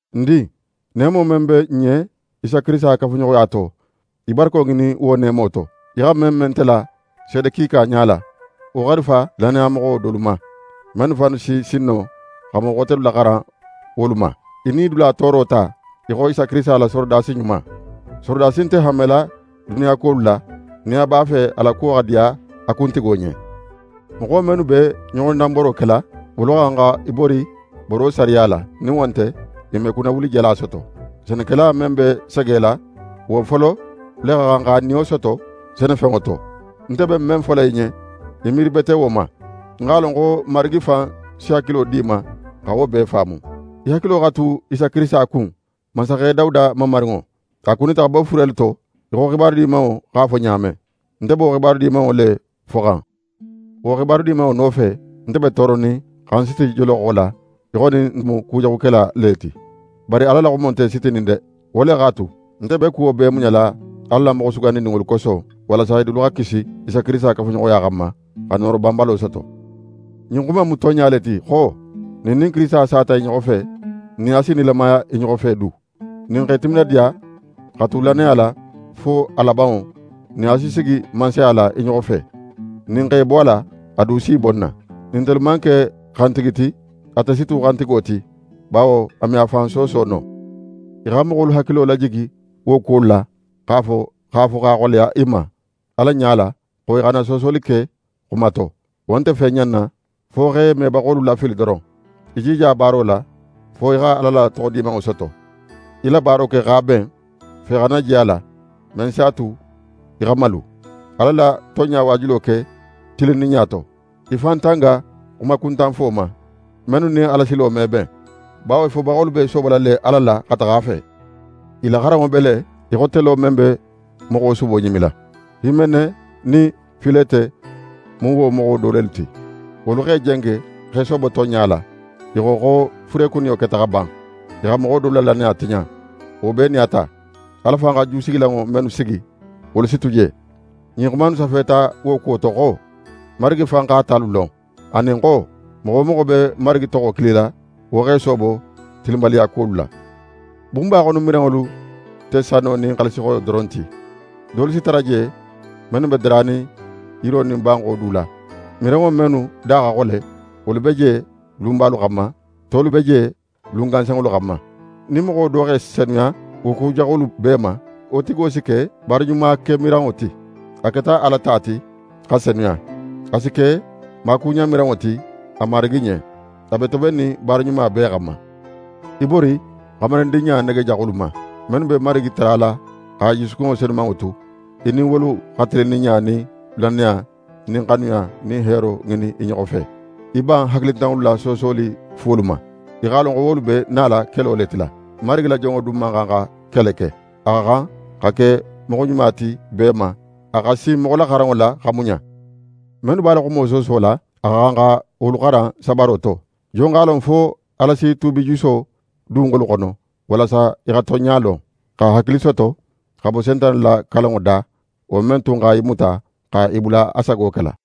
Ń din, neemo men be n ɲen Isa Kirisita kafuɲoxoya to, í barako ŋinin wo neemo to. Í xa men me nte la seede kiika ɲala, wo xarifa lannayamoxo dolu ma, mennu fannu si sin no xa moxo xotelu laxaran wolu ma. Í nidula tooro ta, í xo Isa Kirisita la sorodasi ɲuma. Sorodasi nte hanmela duniya kuwolu la, nin a b'a fe a la kuwo xa diya a kuntigo ɲen. Moxo mennu be ɲoxodanboro kela, wolu xa xan xa i bori boro sariya la, nin wo nte, i me kunnawulijala soto. Senekela men be segela, wo folo le xa xan x'a niyo soto senefenŋo to. Nte be men fola í ɲen, í miiri bete wo ma. Ń x'a lon xo Marigi fan si hakilo di í ma xa wo bee faamu. Í hakilo xa tu Isa Kirisita kun, mansaxe Dawuda mamarinŋo. A kunita xa bo furelu to, í xo xibaru Dimanŋo x'a fo ɲa men. Nte be wo Xibaru Dimanŋo le foxan. Wo Xibaru Dimanŋo nofe, nte be tooronin, xa ń siti joloxo la, í xo nin ń mu kujaxukela le ti. Bari Ala la xumo nte sitinin de! Wo le x'a tu, nte be kuwo bee muɲala Ala la moxo sugandininŋolu koso, walasa i dulu xa kisi Isa Kirisita kafuɲoxoya xanma, xa nooro banbalo soto. Ɲin xuma in mu tonɲa le ti xo: «Nin n nin Kirisita sata i ɲoxo fe, n nin a si nilamaya i ɲoxo fe du. Nin n x'e timinadiya xa tu lannaya la fo a labanŋo, n nin a si sigi mansaya la i ɲoxo fe. Nin n x'e bo a la, a du si í bo n na. Nin ntelu man ke xantigi ti, ate si tu xantigo ti, bawo a me a fan sooso no.» Í xa moxolu hakilo lajigi wo kuwolu la, x'a fo x'a xoleya i ma Ala ɲala xo i xana soosoli ke xuma to. Wo nte fen ɲanna, fo x'e mebaxolu lafili doron. Í jija baaro la, fo í xa Ala la toxo dimanŋo soto. Í la baaro ke x'a ben; fe xana je a la, men si a tu í xa malu. Ala la tonɲa waajulo ke tilinninɲa to. Í fan tanga xumakuntanfo ma, mennu nin Alasilo me ben, bawo i fobaxolu b'e soobola le Ala la xa taxa a fe. I la xaranŋo be le í xo telo men be moxo subo ɲimila. Himene nin Filete mu wo moxo dolu ti. Wolu x'e jenge, x'e soobo tonɲa la. I xo, xo furekuniyo keta xa ban. I xa moxo dolu la lannaya tiɲa. Wo bee nin a ta, Ala fan xa jusigilanŋo mennu sigi, wolu si tu je. Ɲin xuma innu safeta wo kuwo to xo: «Marigi fan x'a talu lon», anin xo: «Moxo wo moxo be Marigi toxo kilila, wo x'é soobo tilinbaliyakuwolu la.» Bunba xono miranŋolu nte sano nin xaalisixoyo doron ti, dolu si tara je mennu be daranin yiro nin banxo du la. Miranŋo mennu da xa xole, wolu be je lunbalu xanma, tolu be je lun gansanŋolu xanma. Nin moxo do x'é senuya wo ku jaxolu bee ma, wo tigo si ke baara ɲumakemiranŋo ti; a keta Ala ta ti, xa senuya. A si ke maakuɲanmiranŋo ti a Marigi ɲen. A be tobennin baara ɲuma bee xanma. Í bori xamarindinɲa nege jaxolu ma. Mennu be Marigi tarala xa i jusukunŋo senumanŋo tu, í nin wolu xa tilinninɲa nin lannaya nin xanuya nin heero ŋinin i ɲoxo fe. Í ban hakilintanŋolu la soosoli fuwolu ma. Í x'a lon xo wolu be nala kelo le tila. Marigi la jonŋo dun man xan xa kele ke. A xa xan xa ke moxo ɲuma ti bee ma, a xa sin moxolaxaranŋo la, xa muɲa. Mennu b'a la xumo soosola, a xa xan xa wolu xaran sabaro to. Jon x'a lon fo Ala si tuubijuso dun wolu xono, walasa i xa tonɲa lon, xa hakili soto, xa bo Sentane la kalanŋo da, wo men tun xa i muta xa i bula a sago kela?